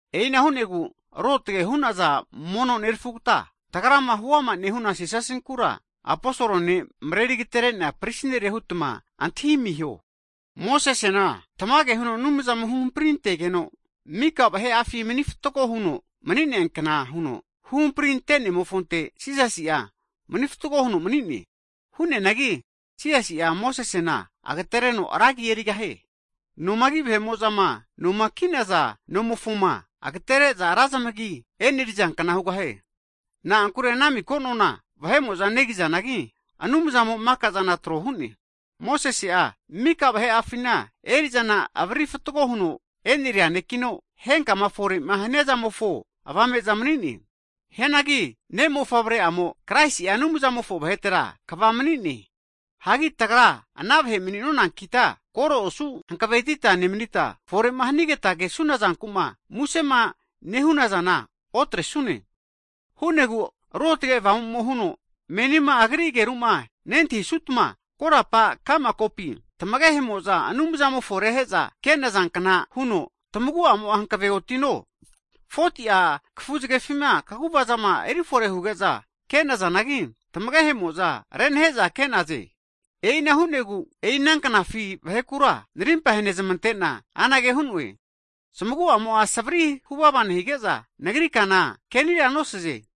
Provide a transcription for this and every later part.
E'ina hu'negu ruotage hu'naza mono nerafugata, tagrama huama nehuna Jisasinkura Aposol ne' mareri agaterenea prisi nere hutma antahi amiho. Mosesena tamage huno Anumzamo huhampri antegeno mika vahe'afi mani fatgo huno mni'neankna huno, huhampri ante'nemofonte Jisasi'a mani fatgo huno mani'ne. Hu'neanagi Jisasi'a Mosesena agatereno ra agi erigahie. Nomagi vahe'mo'zama noma ki'naza nomofoma agatere'za ra zamagi enerizankna hugahie. Na'ankure ana miko nona vahe'mo'za negizanagi, Anumzamo mika'zana trohune. Mosese'a mika vahe'afina eri'zana avariri fatgo huno eneria nekino, henkama fore'ma hanizamofo avame'za mni'ne. Hianagi Ne' mofavre'amo Kraisi'a Anumzamofo vahetera kva mani'ne. Hagi tagra ana vahe mani'nonankita, koro osu hankavetita nemanita, fore'ma hanigeta kesuna zanku'ma musema nehunazana otresune. Hu'negu Ruotge Avamumo huno, Menima Agri ageruma nentahisutma, korapa ka'ma kopi tamagehe'mo'za Anumzamofo rehe'za ke'nazankna huno, tamagu'amo'a hankave otino. 40ti'a kafu zgefima kaguvazama erifore huge'za ke'nazanagi, tamagehemo'za renahe'za ke'naze E'ina hu'negu, e'i ananknafi vahekura narimpa henezamante'na, anage hu'noe, zamagu'amo'a savri huvava nehige'za, Nagri kana kenira nosaze.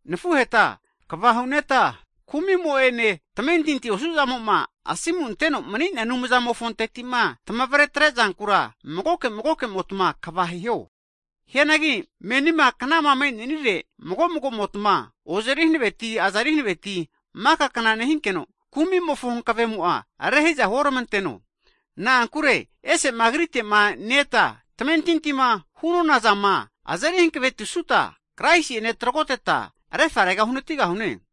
Nafuheta kva hu'neta kumi'mo'ene tamentinti osu'zamoma asimu anteno mni'nea Anumzamofonteti'ma, tamavretre zankura magoke magokemotma kva hiho. Hianagi menima knama me'nenire, mago magomotma ozeri hanaveti, azeri hanaveti maka kna nehinkeno, kumi'mofo havigemo'a rehiza huoramanteno. Na'ankure ese'ma Agritema ne-eta, tamentintima hu'nonazama azeri hankavetisuta, Kraisi'ene tragoteta vgaretera uhanatigahune.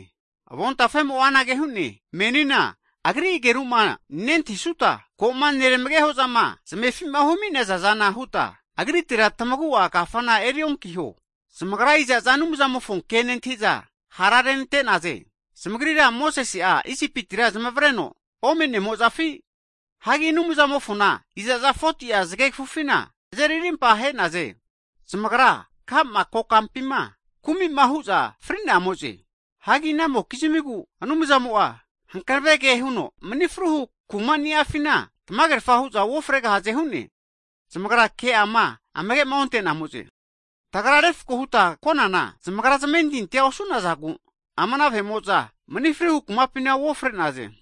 Avontafemo'a anage hu'ne, Menina Agri ageruma nentahisuta, koma neramagehozama zmefima humi'nazaza huta, Agritera tamagu'a kafana eri'onkiho hu'ne. Zamagra iza'za Anumzamofo ke nentahiza hara rente'naze? Zamagrira Mosese'a Isipitira zamavreno omenemozafi? Hagi Anumzamofona iza'za 40ti'a zage kafufina azeri rimpa he'naze? Zamagra ka'ma kokampima kumi'ma hu'za fri'nazamoze. Hagi inamokizmigu Anumzamo'a hankave ke huno, mani fruhu kuma ni'afina tamagerafa hu'za uofregahaze hu'ne? Zamagra ke'ama amage'ma onte'namoze. Tagra refkoma huta konana zamagra zamentintia osu'nazagu, ama ana vahe'mo'za manifruhu kumapima uofre'naze.